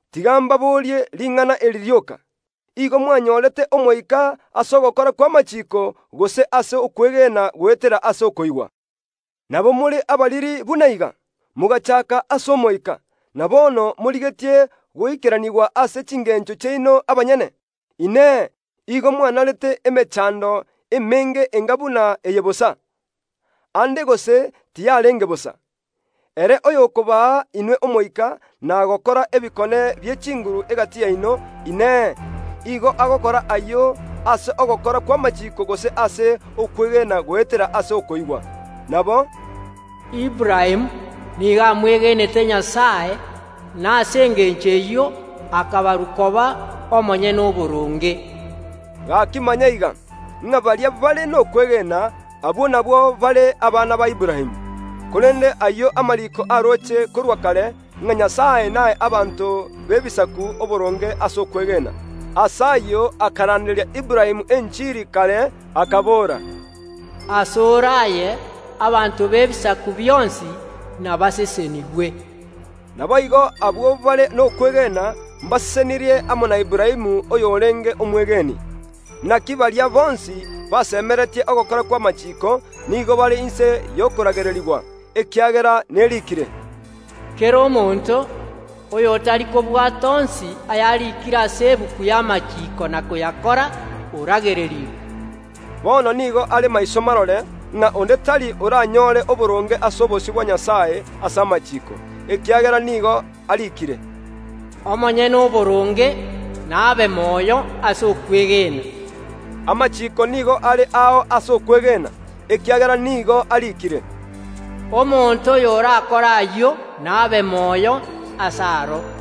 Tiga mbaborie ring’ana eri rioka: Igo mwanyorete Omoika ase ogokora kw’amachiiko, gose ase okwegena goetera ase okoigwa? Nabo more abariri buna iga? Mogachaaka ase Omoika, na bono morigetie goikeranigwa ase chingencho chiaino abanyene? Inee! Igo mwanarete emechando emenge enga buna eye bosa? Aande gose tiyarenge bosa. Ere oyokobaa inwe Omoika na gokora ebikone bie chinguru egati yaino, Inee, igo agokora ayio ase ogokora kw’amachiiko gose ase okwegena goetera ase okoigwa? Nabo “Aburaamu nigo amwegenete Nyasae, na ase engencho eyio akabarwa koba omonyene oboronge.” Gaki manya iga, ng’a baria bare nokwegena, abwo nabwo bare abana ba Aburaamu. Korende ayio amariiko aroche korwa kare, ng’a Nyasae nae abanto b’Ebisaku oboronge ase okwegena. Ase ayio akaranderia Aburaamu enchiri kare, akabora, “Asore aye abanto b’ebisaku bionsi nabasesenigwe.” Naboigo abwo bare nokwegena mbasesenirie amo na Aburaamu oyorenge omwegeni. Naki baria bonsi basemeretie ogokora kw’amachiiko, nigo bare inse y’okoragererigwa, ekiagera neriikire, “Kera omonto oyotari kobwata onsi ayarikire ase egetabu y’amachiiko na koyakora oragererigwe.” Bono nigo are maiso marore, ng’a onde tari oranyore oboronge ase obosio bwa Nyasae ase amachiiko; ekiagera nigo ariikire, “Omonyene oboronge nabe moyo ase okwegena.” Amachiiko nigo are ao ase okwegena, ekiagera nigo ariikire, “Omonto oyorakore ayio nabe moyo ase aro.”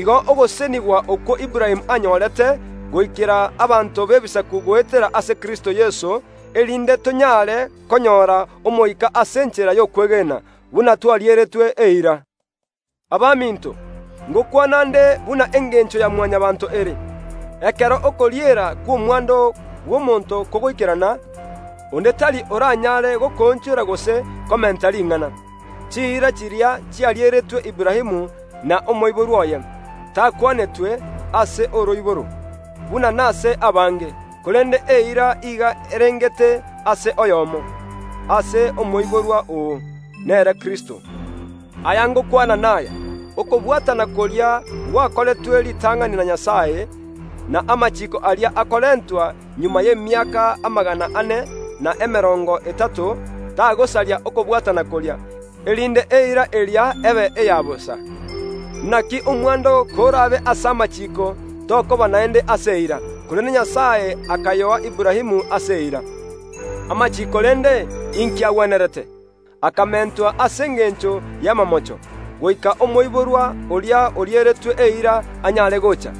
Igo ogosesenigwa okwo Aburaamu anyorete goikera abanto b’Ebisaku goetera ase Kristo Yeso, erinde tonyare konyora Omoika ase enchera y’okwegena, buna twarieretwe eira. Abaminto, ngokwana ’nde ase omobwekano bw’amang’ana a kera rituko. Ekero okoriera kw’omwando bw’omonto kogoikerana, onde tari oranyaare gokoonchora gose komenta ring’ana. Chiira chiria chiarieretwe Aburaamu na omoiborwa oye. Biblia teri gokwana amang’ana aya, “Ase oroiboro” buna nase abange; korende eira iga erengete ase oyomo, “Ase omoiborwa oo”, nere Kristo. Aya ngokwana naya: Okobwatana koria gwakoretwe ritang’ani na Nyasae; na amachiiko aria akarentwa magega y’emiaka amagana ane, na emerongo etato, tagosaria okobwatana koria, erinde eira eria ebe eya bosa. Naki omwando korabe ase amachiiko, tokoba naende ase eira; korende Nyasae akayoa Aburaamu ase eira. Amachiiko rende, inki agwenerete? Akamentwa ase engencho y’amamocho, goika omoiborwa oria orieretwe eira anyare gocha.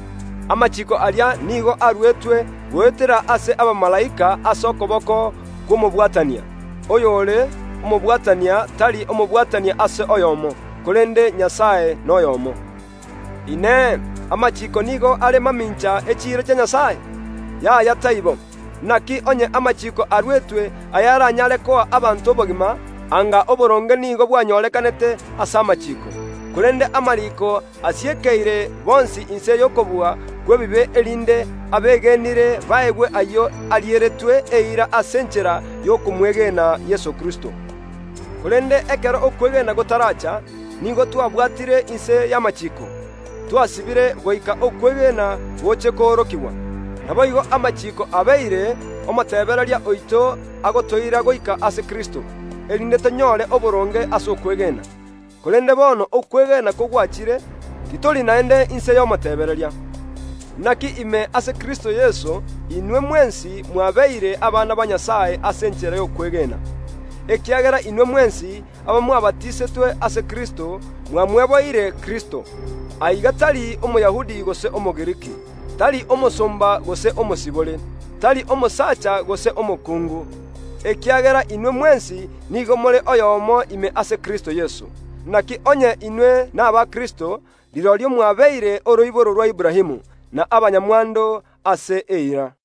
Amachiiko aria nigo aruetwe goetera ase abamalaika ase okoboko kw’omobwatania. Oyore omobwatania tari omobwatania ase oyomo, korende Nyasae noyomo. Inee! Amachiiko nigo are mamincha yechiira chia Nyasae? Yaya, taibo! Naki onye amachiiko aruetwe ayaranyare koa abanto obogima, anga oboronge nigo bwanyorekanete ase amachiiko. Korende amariiko asiekeire bonsi inse y’okobua kw’ebibe, erinde abegenire baegwe ayio ariereretwe eira ase enchera y’okomwegena Yeso o Kristo. Korende ekero okwegena gotaracha, nigo twabwatire inse y’amachiiko, twasibire goika okwegena goche koorokigwa. Naboigo amachiiko abeire omotebereria oito agotoira goika ase Kristo, erinde tonyore oboronge ase okwegena. Korende bono okwegena kogwachire, titori naende inse y’omotebereria. Naki ime ase Kristo Yeso inwe mwensi mwabeire abana ba Nyasae ase enchera y’okwegena. Ekiagera inwe mwensi, abamwabatisetwe ase Kristo, mwamweboire Kristo. Aiga tari Omoyahudi gose Omogiriki, tari omosomba gose omosibore, tari omosacha gose omokungu, ekiagera inwe mwensi nigo more oyomo ime ase Kristo Yeso. Naki onye inwe naba Kristo, rirorio mwabeire oroiboro rwa Aburaamu, na abanyamwando ase eira.